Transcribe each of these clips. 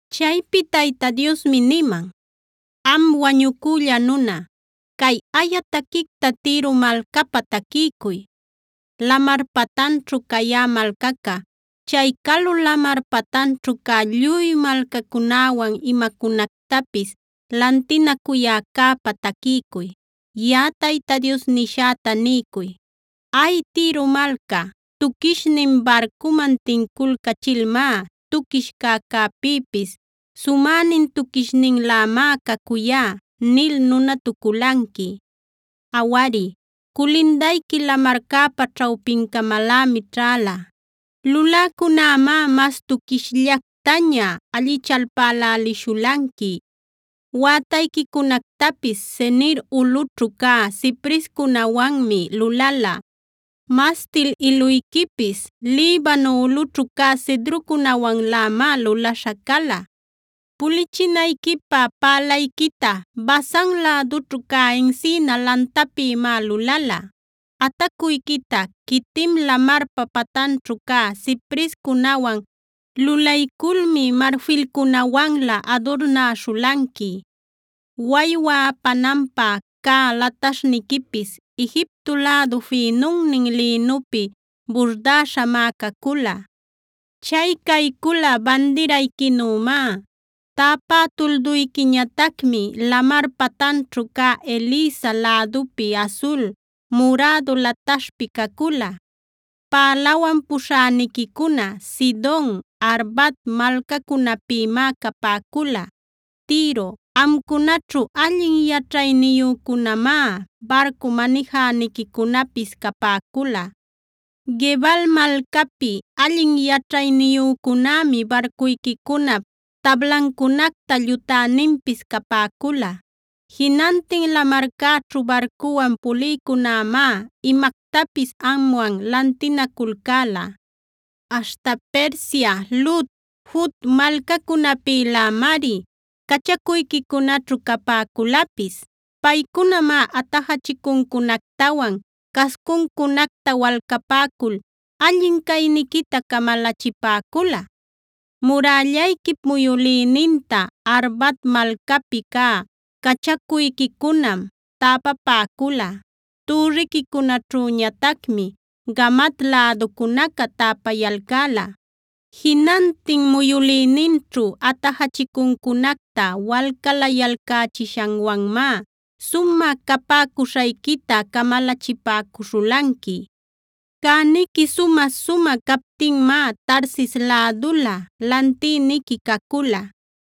Chaypi Tayta Diosmi niman: “Am wañucülla nuna, cay aya taquicta Tiro malcapä taquiycuy. Lamar patanćhu cayä malcaca, chay calu lamar patanćhu cä lluy malcacunäwan imacunactapis lantinacuyäcäpä taquiycuy. Yaꞌa Tayta Dios nishäta niycuy: “Ay, Tiro malca, tuquishnin barcuman tinculcachilmá ‘Tuquish cäcäpïpis sumänin tuquishninlämá cacuyá’ nil nunatuculanqui. Awari, culindayqui lamarcäpa ćhawpincamalämi ćhäla. Luläcunämá mas tuquishllactaña allichalpälälishulanqui. Wätayquicunactapis Senir ulꞌućhu cä ciprescunawanmi lulala. Mastila iluyquipis Libano ulꞌućhu cä cedrocunawanlämá lulaśha cala. Pulichinayquipä pälayquita Basan lädućhu cä encina lantapïmá lulala. Atacuyquita Quitim lamarpa patanćhu cä ciprescunawan lulayculmi marfilcunawanlä adurnäśhulanqui. Waywa apananpä cä lataśhniquipis Egipto lädu fïnunnin lïnupi burdäśhamá cacula. Chay caycula bandirayquinümá. Täpä tulduyquiñatacmi lamar patanćhu cä Elisa lädupi asul, murädu lataśhpi cacula. Pälawan puśhäniquicuna Sidon, Arvad malcacunapïmá capäcula. Tiro, amcunaćhu allin yaćhayniyücunämá barcu manijäniquicunapis capäcula. Gebal malcapi allin yaćhayniyücunämi barcuyquicunap tablancunacta llutäninpis capäcula. Jinantin lamarcäćhu barcuwan pulïcunämá imactapis amwan lantinaculcäla. “Aśhta Persia, Lud, Fut malcacunäpïlämari cachacuyquicunaćhu capäculapis. Paycunamá atajachicuncunactawan cascuncunacta walcapäcul allin cayniquita camalachipäcula. “Murällayquip muyülïninta Arvad malcapi cä cachacuyquicunam täpapäcula. Türriquicunaćhüñatacmi Gamad läducunaca täpayalcäla. Jinantin muyülïninćhu atajachicuncunacta walcalayalcächishanwanmá sumä capäcuśhayquita camalachipäcuśhulanqui. “Cäniqui sumä-sumä captinmá Tarsis lädulä lantïniqui cacula.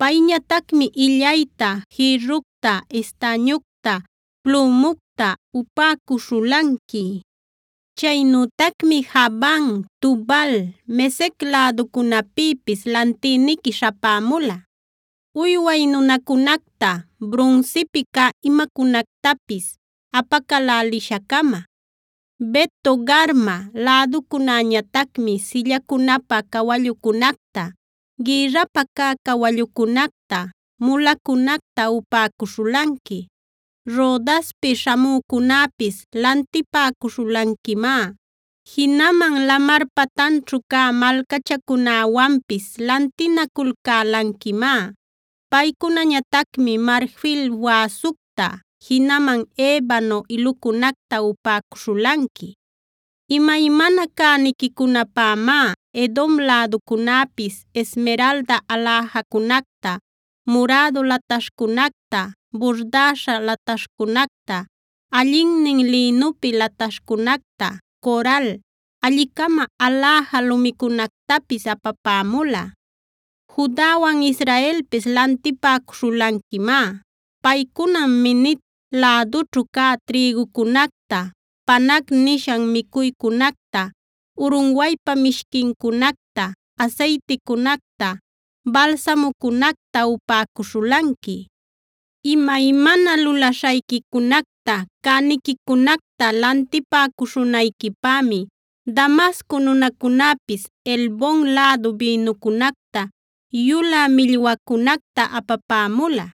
Payñatacmi illayta, jïrructa, estañucta, plümucta upäcuśhulanqui. Chaynütacmi Javan,b Tubal, Mesec läducunapïpis lantïniqui śhapämula, uyway nunacunacta, brunsipi cä imacunactapis apacälälisha-cama. Bet-togarma läducunäñatacmi sillacunapä cawallucunacta, gïrrapä cä cawallucunacta, mulacunacta upäcuśhulanqui. Rodaspic śhamücunäpis lantipäcuśhulanquimá. Jinaman lamar patanćhu cä malcachacunäwanpis lantinaculcälanquimá. Paycunañatacmi marfil wäsucta, jinaman ebano ilucunacta upäcuśhulanqui. “Imaymana cäniquicunapämá Edom läducunäpis esmeralda aläjacunacta, murädu lataśhcunacta, burdäśha lataśhcunacta, allinnin lïnupi lataśhcunacta, coral, alli-cama aläja lumicunactapis apapämula. Judawan Israelpis lantipäcuśhulanquimá. Paycunam Minit lädućhu cä trïgucunacta, panag nishan micuycunacta, urunwaypa mishquincunacta, asayticunacta, balsamucunacta upäcuśhulanqui. “Imaymana lulaśhayquicunacta, cäniquicunacta lantipäcuśhunayquipämi Damasco nunacunäpis Helbon lädu bïnucunacta, yulä millwacunacta apapämula.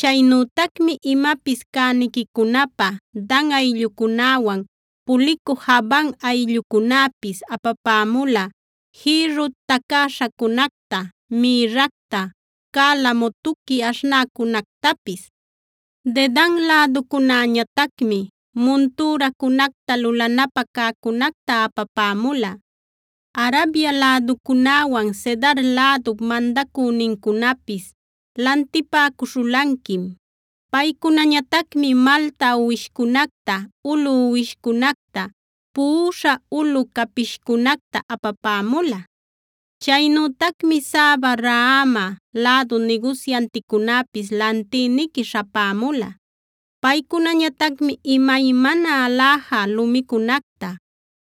Chaynütacmi imapis cäniquicunapä Dan ayllucunäwan pulicü Javan ayllucunäpis apapämula jïrru tacäśhacunacta, mïrracta, calamo tuqui aśhnäcunactapis. “Dedan läducunäñatacmi muntüracunacta lulanapä cäcunacta apapämula. Arabia läducunäwan Cedar lädup mandacünincunapis lantipäcuśhulanquim. Paycunañatacmi malta uwishcunacta, ulu uwishcunacta, puꞌuśha ulu capishcunacta apapämula. Chaynütacmi Saba, Raama lädu nigusyanticunäpis lantïniqui śhapämula. Paycunañatacmi imaymana aläja lumicunacta,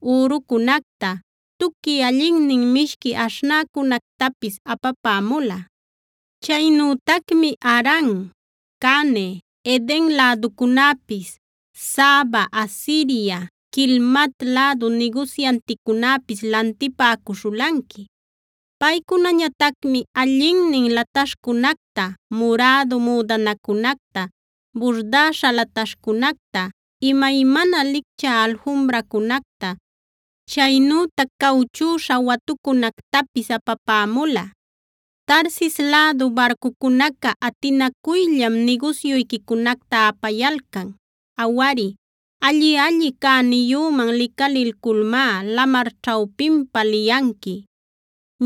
ürucunacta, tuqui allinnin mishqui aśhnäcunactapis apapämula. “Chaynütacmi Haran, Cane, Eden läducunäpis, Saba, Asiria, Quilmad lädu nigusyanticunäpis lantipäcuśhulanqui. Paycunañatacmi allinnin lataśhcunacta, murädu müdanacunacta, burdäśha lataśhcunacta, imaymana lichcä alfumbracunacta, chaynütac cawchüśha watucunactapis apapämula. “Tarsis lädu barcucunaca atinacuyllam nigusyuyquicunacta apayalcan. “Awari, alli-alli cäniyüman licalilculmá lamar ćhawpinpa liyanqui.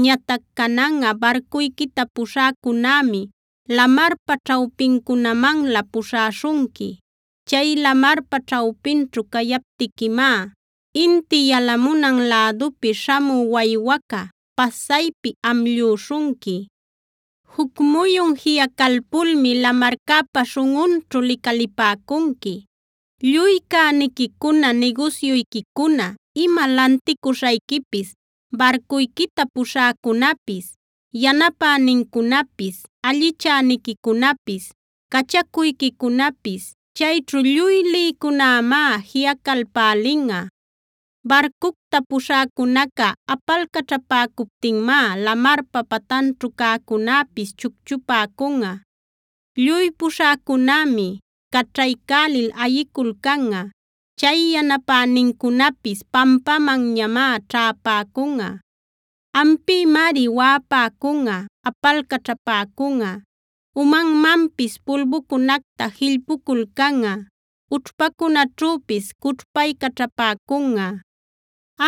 Ñatac cananꞌa barcuyquita puśhäcunämi lamarpa ćhawpincunamanlä puśhäshunqui. Chay lamarpa ćhawpinćhu cayaptiquimá inti yalamunan lädupi śhamü waywaca pasaypi amllüśhunqui. Juc muyun jiꞌacalpulmi lamarcäpa śhunꞌunćhu licalipäcunqui; lluy cäniquicuna, nigusyuyquicuna, ima lanticuśhayquipis, barcuyquita puśhäcunäpis, yanapänincunapis, allichäniquicunapis, cachacuyquicunapis, chayćhu lluy lïcunämá jiꞌacalpälinꞌa. Barcucta puśhäcunaca apalcaćhapäcuptinmá lamarpa patanćhu cäcunäpis chucchupäcunꞌa. Lluy puśhäcunämi caćhaycälil ayiculcanꞌa; chay yanapänincunapis pampämanñamá ćhäpäcunꞌa. Ampïmari waꞌapäcunꞌa, apalcaćhapäcunꞌa, umanmanpis pulbucunacta jillpuculcanꞌa, ućhpacunaćhüpis cućhpaycaćhapäcunꞌa.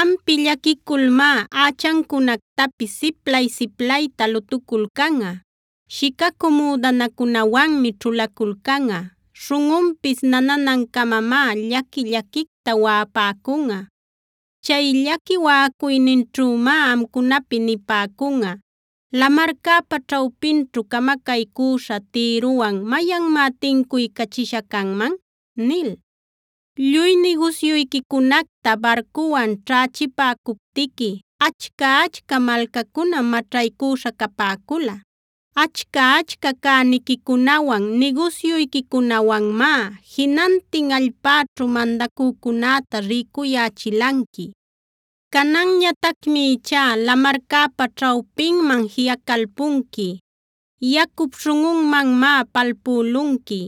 Ampi llaquiculmá ächancunactapis siplay-siplayta lutuculcanꞌa, shicacü müdanacunawanmi ćhulaculcanꞌa, śhunꞌunpis nananancamamá llaqui-llaquicta waꞌapäcunꞌa. Chay llaqui waꞌacuyninćhümá amcunapi nipäcunꞌa: ‘¿Lamarcäpa ćhawpinćhu camacaycüśha Tirowan mayanmá tincuycachisha canman?’ nil. Lluy nigusyuyquicunacta barcuwan ćhächipäcuptiqui, achca-achca malcacunam maćhaycüśha capäcula. Achca-achca cäniquicunawan, nigusyuyquicunawanmá jinantin allpäćhu mandacücunäta rïcuyächilanqui. Cananñatacmi ichá lamarcäpa ćhawpinman jiꞌacalpunqui. Yacup śhunꞌunmanmá palpülunqui.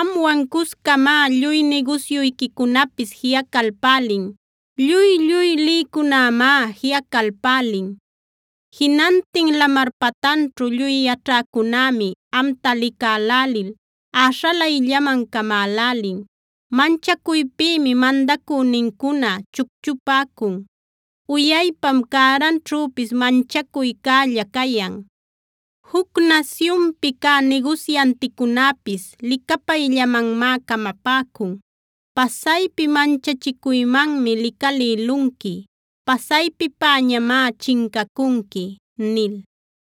Amwan cuscamá lluy nigusyuyquicunapis jiꞌacalpälin. Lluy-lluy lïcunämá jiꞌacalpälin. Jinantin lamar patanćhu lluy yaćhäcunämi amta licälälil äśhalayllaman camälälin. Manchacuypïmi mandacünincuna chucchupäcun; uyaypam cäranćhüpis manchacuycälla cayan. Juc nasyunpi cä nigusyanticunäpis licapayllamanmá camapäcun. Pasaypi manchachicuymanmi licalïlunqui. Pasaypipäñamá chincacunqui” nil.